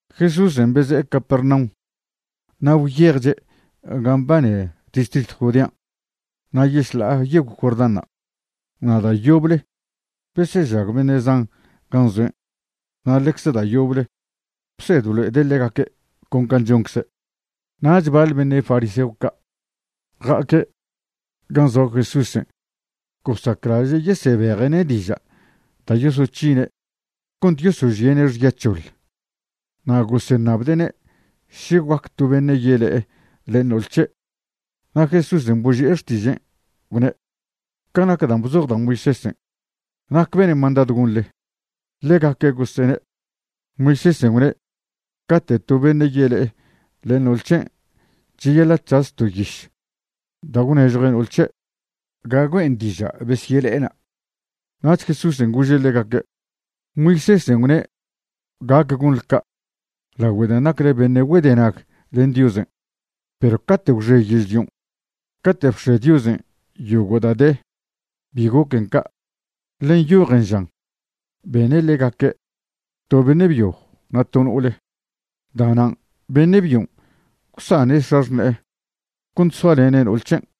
Jesúsen' beze'e Capernaum na' gwyejche' gan' mbane distritw Judean' na' yešḻa'a yegw Jordánṉa'. Na' da' yoble besežag beṉe' zan gan' zoen' na' ḻecze da' yoble bsed blo'ede' ḻegaque' con can' choncze'. Nach baḻ beṉe' fariseo ca' ja'aque' gan' zoa Jesúsen' gosaclaže' yesebeje'ne' diža' da' yosoc̱hine' cont yosožie'ne' xya c̱hoḻ, na' goseṉabde'ne' še guac to beṉe' yele'e len no'ol c̱he'. Na' Jesúsen' boži'e xtižen', gwne': ―Ca nac dan' bzoj da' Moisésen', ¿nac bene' mandadw gonḻe? Ḻegaque' gosene': ―Moisésen' gwne' cate' to beṉe' yele'e len no'ol c̱hen' cheyaḻa' c̱has to yiš da' gwnežjue' no'ol c̱he' ga güe'en diža' besyele'ena'. Nach Jesúsen' gože' ḻegaque': ―Moisésen' gwne' gac gonḻe ca' lagüe dan' nacle beṉe' güedenag len Diosen'. Perw cate' gwxe yežlion', cate' bx̱e Diosen' yogo' da' de, bi goquen ca'. Ḻe nyojen žan: “Bene' ḻegaque', to beṉe' byo na' to no'ole.” “Da'nan' beṉe' byon' gwsane' x̱axṉe'e cont soalene' no'ol c̱hen',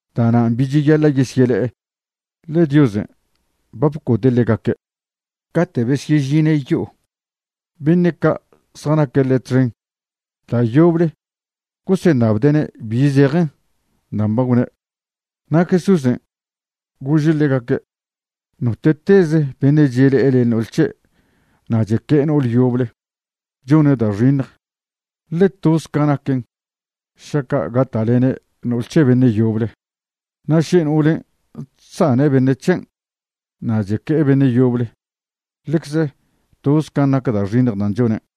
Da'nan' bi cheyaḻa' yesyele'e, ḻe Diosen' ba bcode' ḻegaque'. Cate' besyežine' yo'o, beṉe' ca' zjanaque' ḻe' txen da' yoble goseṉabde'ne' bi zejen dan' ba gwne'. Na' Jesúsen' gože' ḻegaque': ―Note'teze beṉe' chele'e len no'ol c̱he' na' cheque'e no'ol yoble, chone' da' xiṉj, ḻe toz ca naquen šaca' gata'lene' no'ol c̱he beṉe' yoble. Na' še no'olen' chsane' beṉe' c̱hen' na' cheque'e beṉe' yoble, ḻecze toz can' nac da' xiṉj da' chonen'.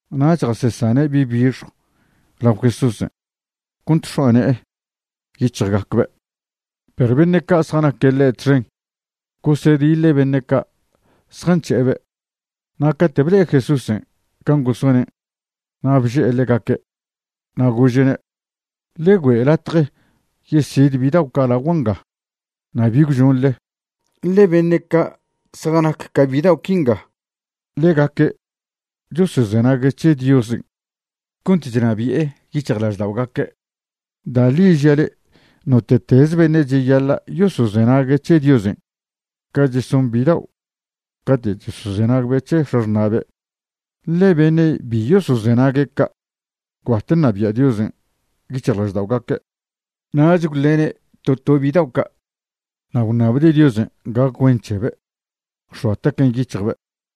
Nach jasesane' bi' bixjw lao Jesúsen' cont x̱oa ne'e yic̱hjgacbe', perw beṉe' ca' zjanaque' ḻe' txen gosediḻe' beṉe' ca' zjanc̱he'ebe'. Na' cate' ble'e Jesúsen' can' gosonen' na' bže'e ḻegaque' na' gože'ne': ―Ḻe güe' latje yesid bidao' ca' lagua' nga na' bi gwžonḻe, ḻe beṉe' ca' zjanac ca bidao' quinga, ḻegaque' chosozenague' c̱he Diosen' cont chnabi'e yic̱hjlažda'ogaque'. Da' ḻi žia' le'e, note'teze beṉe' cheyaḻa' yosozenague' c̱he Diosen' ca cheson bidao' cate' chosozenagbe' c̱he x̱axṉa'be', ḻe beṉe' bi yosozenague' ca', gwbat ṉabia' Diosen' yic̱hjlažda'ogaque'. Nach gwḻene' to to bidao' ca' na' gwṉabde' Diosen' gac güen c̱hebe', gwx̱oa taquen' yic̱hjbe'.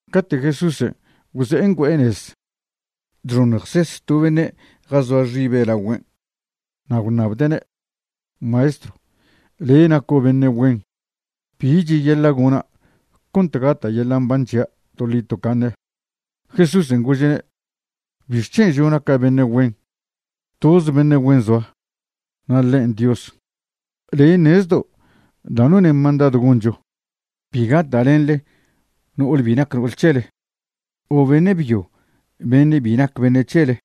Cate' Jesúsen' gwze'e ngüe'e nez, chxoṉjses to beṉe' jazoa xibe' lagüen' na' gwṉabde'ne': ―Maestro, le' naco' beṉe' güen. ¿Bi cheyaḻa' gona' cont gata' yeḻa' mban c̱hia' toḻi tocaṉe'? Jesúsen' gože'ne': ―¿Bixc̱hen' žo' naca' beṉe' güen? Toze beṉe' güen zoa, na' ḻen' Dios. Le' ṉezdo' da' none' mandadw goncho: “Bi gata'lenḻe no'ol bi nac no'ol c̱hele o beṉe' byo beṉe' bi nac beṉe' c̱hele;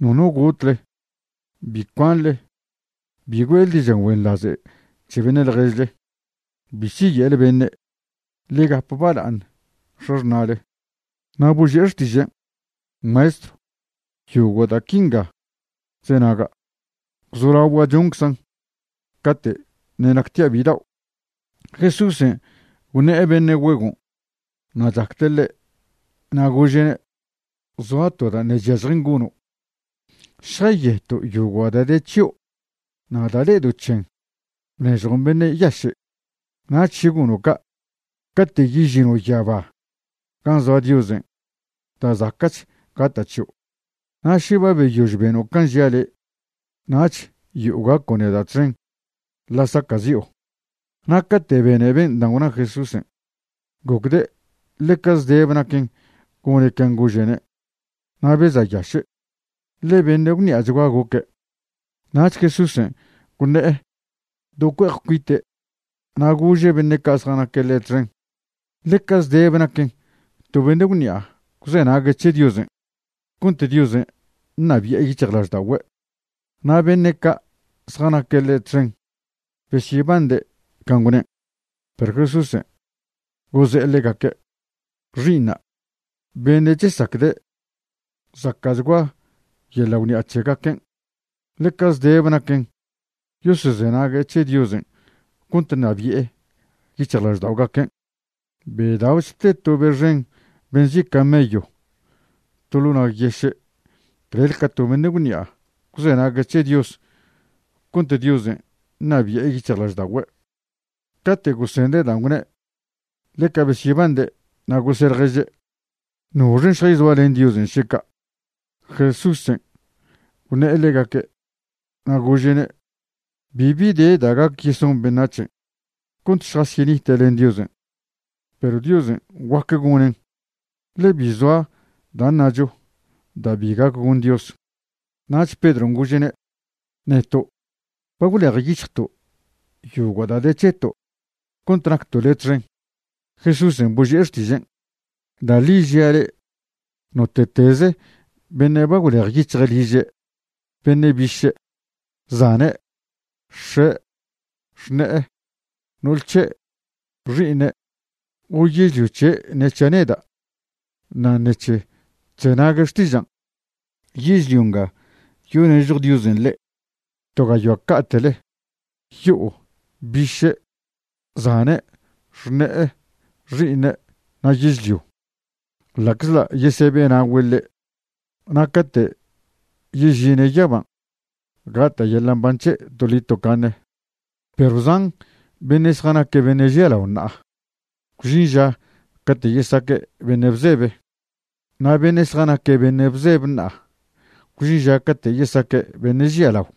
nono gotle; bi cuanḻe; bi güe'le diža' güenḻaže' c̱he beṉe' ḻježle; bi siye'le beṉe'; ḻe gap bala'aṉ x̱axṉa'le.” Na' boži'e xtižen': ―Maestro, yogo' da' quinga chzenaga', gwzolagua' chonczan' cate' ṉe' nactia' bidao'. Jesúsen' gwṉe'e beṉe' güegon' na' chacde' ḻe', na' gože'ne': ―Zoa to da' ṉe' chyažjen gono': šjayeto' yogo' da' de c̱hio' na' da' le'edo' c̱hen bnežjon beṉe' yaše'. Nach še gono' ca', cate' yežino' yaba gan' zoa Diosen' da' zaca'ch gata' c̱hio'. Na' še ba beyož beno' can' žia' le', nach yo'o gaco' neda' txen ḻa' saca'zi'o. Na' cate' bene ben' dan' gwna Jesúsen', gocde' ḻeca zdebe naquen gone' can' gože'ne', na' beza'yaše', ḻe beṉe' gwṉi'achgua goque'. Nach Jesúsen' gwṉe'e do cue'ej cuite' na' gože' beṉe' ca' zjanaque' ḻe' txen: ―Ḻeca zdeb naquen to beṉe' gwṉi'a gwzenague' c̱he Diosen' cont Diosen' ṉabi'e yic̱hjlažda'ogüe'. Na' beṉe' ca' zjanaque' ḻe' txen besyebande' can' gwnen', perw Jesúsen' goze'e ḻegaque': ―Xi'iṉa', beṉe' chesacde' zaca'chgua yeḻa' gwṉi'a c̱hegaquen', ḻeca zdebe naquen yosozenague' c̱he Diosen' cont ṉabi'e yic̱hjlažda'ogaquen'. Bedao'ch te to be xen be nzi' camello to ḻo' nag yeše' clel ca to beṉe' gwṉi'a gwzenague' c̱he Dios cont Diosen' ṉabi'e yic̱hjlažda'ogüe'. Cate' gosende' dan' gwne', ḻeca besyebande' na' gose' ḻježe': ―¿Noxen' šjayzoa len Diosen' še ca'? Jesúsen' gwṉe'e ḻegaque' na' gože'ne': ―Bibi de da' gac yeson beṉac̱hen' cont šjasyenite' len Diosen', perw Diosen' guac gonen'; ḻe bi zoa da' ṉacho da' bi gac gon Dios. Nach Pedron' gože'ne': ―Neto' ba gwlejyic̱hjto' yogo' da' de c̱heto' cont nacto' le' txen. Jesúsen' boži'e xtižen': ―Da' ḻi žia' le', note'teze beṉe' ba gwlejyic̱hje' liže', beṉe' biše', zane', x̱e', xṉe'e, no'ol c̱he', xi'iṉe', o yežlio c̱he' ṉe c̱hia' neda' na' ṉec̱he chzenague' xtižan', yežlio nga yonežjo Diosen' ḻe' to gayoa ca'te'le, yo'o, biše', zane', xṉe'e, xi'iṉe' na' yežlio, ḻa'czḻa' yesebe'na'ogüe' ḻe'. Na' cate' yežine' yaban' gata' yeḻa' mban' c̱he' toḻi tocaṉe. Perw zan beṉe' zjanaque' beṉe' žialao ṉa'a, gwžin ža cate' yesaque' beṉe' bzebe; na' beṉe' zjanaque' beṉe' bzebe ṉa'a, gwžin ža cate' yesaque' beṉe' žialao.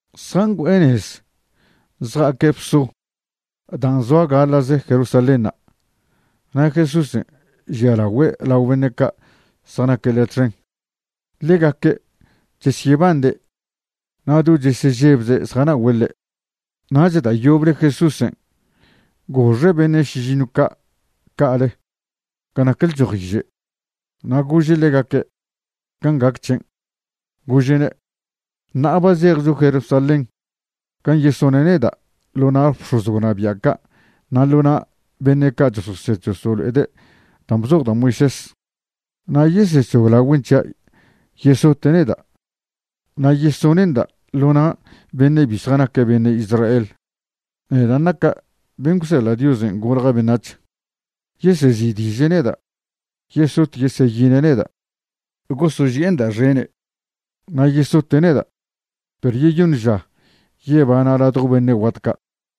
Zjangüe'e nez zja'aque' bso dan' zoa gaḻa'ze Jerusalénṉa' na' Jesúsen' žialagüe' lao beṉe' ca' zjanaque' ḻe' txen. Ḻegaque' chesyebande' na' do chesežebze' zjana'ogüe' ḻe'. Nach da' yoble Jesúsen' goxe' beṉe' šižiṉw ca' ca'ale ga nac lchojiže' na' gože' ḻegaque' can' gac c̱hen'. Gože'ne': ―Ṉa'a ba zejcho Jerusalén gan' yesone' neda' ḻo na' bx̱oz gwnabia' ca' na' ḻo na' beṉe' ca' chososed chosolo'ede' dan' bzoj da' Moisés, na' yesec̱hoglagüen' c̱hia' yesote' neda' na' yesone'nda' ḻo na' beṉe' bi zjanaque' beṉe' Israel, nedan' naca' ben' gwseḻa' Dios golja' beṉac̱h. Yesezi'diže' neda', yesot yeseyine' neda', gosoži'enda' xene', na' yesote' neda', perw yeyoṉ ža yebana' ladjo beṉe' guat ca'.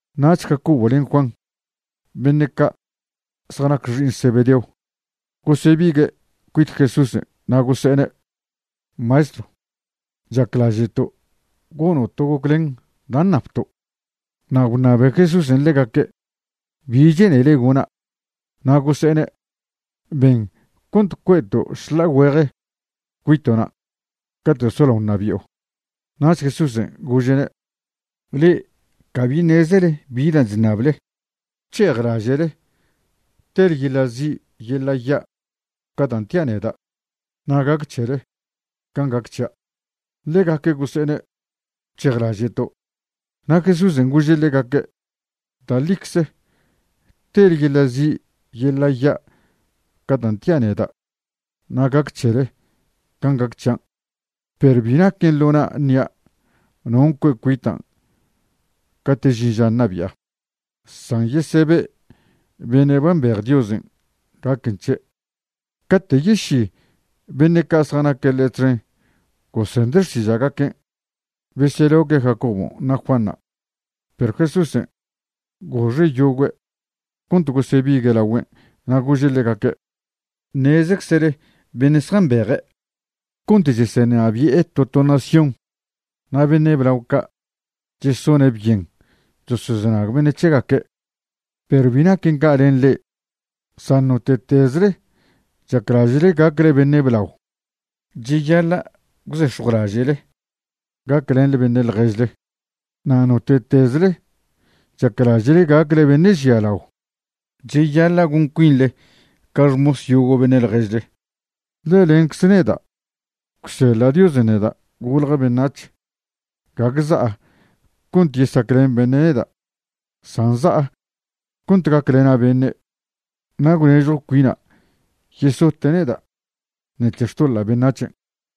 Nach Jacobo len Juan, beṉe' ca' zjanac xi'iṉ Zebedeo, gosebigue' cuit Jesúsen' na' gose'ene': ―Maestro, chaclaže'to' gono' to goclen da' ṉabto'. Na' gwṉabe Jesúsen' ḻegaque': ―¿Bi che'nele gona'? Na' gose'ene': ―Ben cont cue'to' šḻa'a güeje cuito'na' cate' solao ṉabi'o. Nach Jesúsen' gože'ne': ―Le'e cabi ṉezele bi dan' chṉable. ¿Gwc̱hejlaže'le tele yeḻa' zi' yeḻa ya' ca dan' tia' neda' na' gac c̱hele can' gac c̱hia'? Ḻegaque' gose'ene': ―Gwc̱hejlaže'to'. Na' Jesúsen' gože' ḻegaque': ―Da' ḻicze tele yeḻa' zi' yeḻa' ya' ca dan' tia' neda' na' gac c̱hele can' gac c̱hian'. Perw bi naquen ḻo na' ṉia' non' cue' cuitan' cate' žin ža ṉabi'a, san yesebe' beṉe' ba mbej Diosen' gaquen c̱he'. Cate' yeši beṉe' ca' zjanaque' ḻe' txen gosende' xtiža'gaquen', beseloque' Jacobon' na' Juanṉa'. Perw Jesúsen' goxe' yogüe' cont gosebigue' laogüen' na' gože' ḻegaque': ―Ṉezeczele beṉe' zjambeje' cont chesenabi'e to to nación na' beṉe' blao ca' chesone' byen chosozenag beṉe' c̱hegaque'. Perw bi naquen ca' len le'e. San note'tezle chaclaže'le gacle beṉe' blao, cheyaḻa' gwzex̱jwlaže'le gaclenḻe beṉe' ḻježle. Na' note'tezle chaclaže'le gacle beṉe' žialao, cheyaḻa' gon cuinḻe ca xmos yogo' beṉe' ḻježle. Ḻe lencze neda', gwseḻa' Diosen' neda' golja' beṉac̱h, gague za'a cont yesaclen beṉe' neda', san za'a cont gaclena' beṉe', na' gwnežjw cuina' yesote' neda' ṉec̱he xtoḻa' beṉac̱hen'.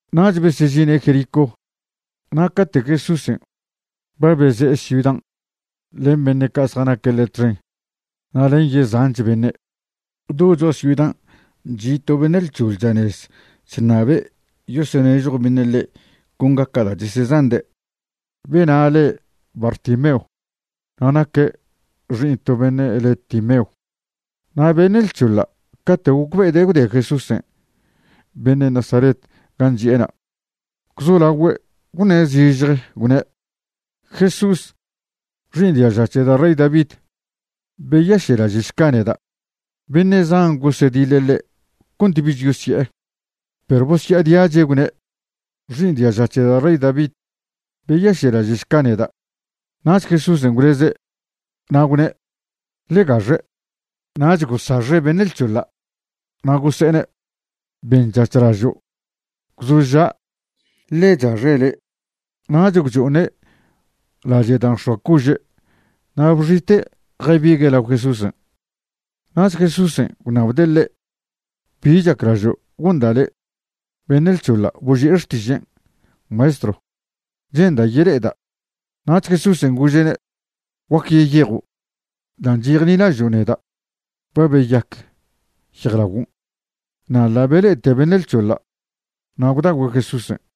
Nach besežine' Jericó. Na' cate' Jesúsen' ba beze'e ciudan' len beṉe' ca' zjanaque' ḻe' txen na' len yezanch beṉe', do cho'a ciudan' chi' to beṉe' lc̱hoḻ chanez chṉabe' yosonežjo beṉe' ḻe' con gaca' da' chesezande'. Bena' le' Bartimeo na' naque' xi'iṉ to beṉe' le' Timeo. Na' beṉe' lc̱hoḻa' cate' gocbe'ede' gwde Jesús beṉe' Nazaret gan' chi'ena', gwzolagüe' gwṉe' zižje gwne': ―¡Jesús, xi'iṉ diaža c̱he da' rey David, beyaše'laže'šca neda'! Beṉe' zan gosediḻe' ḻe' cont bich yosye'e, perw bosya'adiache' gwne': ―¡Xi'iṉ diaža c̱he da' rey David, beyaše'laže'šca neda'! Nach Jesúsen' gwleze' na' gwne': ―Ḻe gaxe'. Nach gosaxe' beṉe' lc̱hoḻa' na' gose'ene': ―Benc̱hac̱hlažo', gwzoža', ḻe chaxe' le'. Nach gwcho'oṉe' lache' da' nx̱oa cože' na' bxite' jabigue' lao Jesúsen'. Nach Jesúsen' gwṉabde' ḻe': ―¿Bi chaclažo' gonda' le'? Beṉe' lc̱hoḻa' boži'e xtižen': ―Maestro, che'nda' yele'eda'. Nach Jesúsen' gože'ne': ―Guac yeyejo'. Dan' chejnilažo' neda' ba beyac yejlaguon'. Na' ḻa' bele'ete beṉe' lc̱hoḻa', na' gwda'ogüe' Jesúsen'.